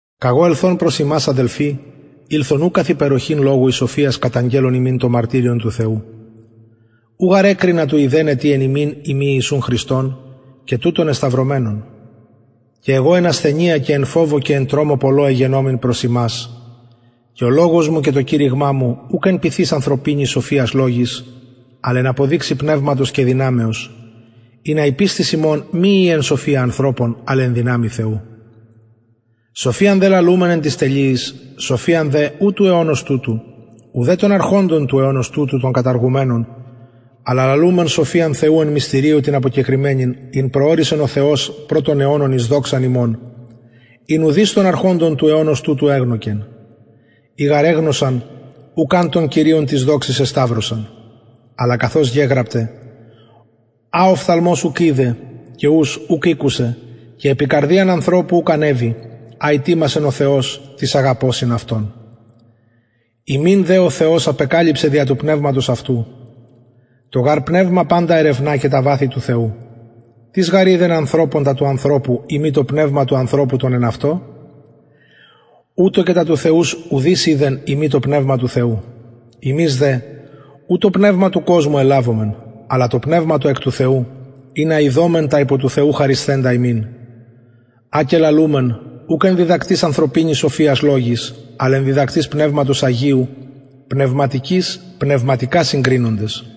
καγω ελθων προς υμας αδελφοι ηλθον ου καθ υπεροχην λογου η σοφιας καταγγελλων υμιν το μαρτυριον του θεου ου γαρ εκρινα του ειδεναι τι εν υμιν ει μη ιησουν χριστον και τουτον εσταυρωμενον και εγω εν ασθενεια και εν φοβω και εν τρομω πολλω εγενομην προς υμας και ο λογος μου και το κηρυγμα μου ουκ εν πειθοις ανθρωπινης σοφιας λογοις αλλ εν αποδειξει πνευματος και δυναμεως ινα η πιστις υμων μη η εν σοφια ανθρωπων αλλ εν δυναμει θεου σοφιαν δε λαλουμεν εν τοις τελειοις σοφιαν δε ου του αιωνος τουτου ουδε των αρχοντων του αιωνος τουτου των καταργουμενων αλλα λαλουμεν σοφιαν θεου εν μυστηριω την αποκεκρυμμενην ην προωρισεν ο θεος προ των αιωνων εις δοξαν ημων ην ουδεις των αρχοντων του αιωνος τουτου εγνωκεν ει γαρ εγνωσαν ουκ αν τον κυριον της δοξης εσταυρωσαν αλλα καθως γεγραπται α οφθαλμος ουκ ειδεν και ους ουκ ηκουσεν και επι καρδιαν ανθρωπου ουκ ανεβη α ητοιμασεν ο θεος τοις αγαπωσιν αυτον ημιν δε ο θεος απεκαλυψεν δια του πνευματος αυτου το γαρ πνευμα παντα ερευνα και τα βαθη του θεου τις γαρ οιδεν ανθρωπων τα του ανθρωπου ει μη το πνευμα του ανθρωπου το εν αυτω ουτως και τα του θεου ουδεις οιδεν ει μη το πνευμα του θεου ημεις δε ου το πνευμα του κοσμου ελαβομεν αλλα το πνευμα το εκ του θεου ινα ειδωμεν τα υπο του θεου χαρισθεντα ημιν α και λαλουμεν ουκ εν διδακτοις ανθρωπινης σοφιας λογοις αλλ εν διδακτοις πνευματος αγιου πνευματικοις πνευματικα συγκρινοντες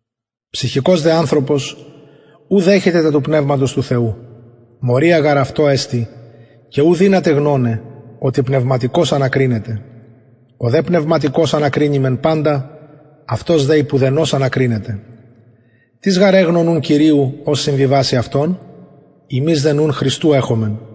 ψυχικος δε ανθρωπος ου δεχεται τα του πνευματος του θεου μωρια γαρ αυτω εστιν και ου δυναται γνωναι οτι πνευματικως ανακρινεται ο δε πνευματικος ανακρινει μεν παντα αυτος δε υπ ουδενος ανακρινεται τις γαρ εγνω νουν κυριου ος συμβιβασει αυτον ημεις δε νουν χριστου εχομεν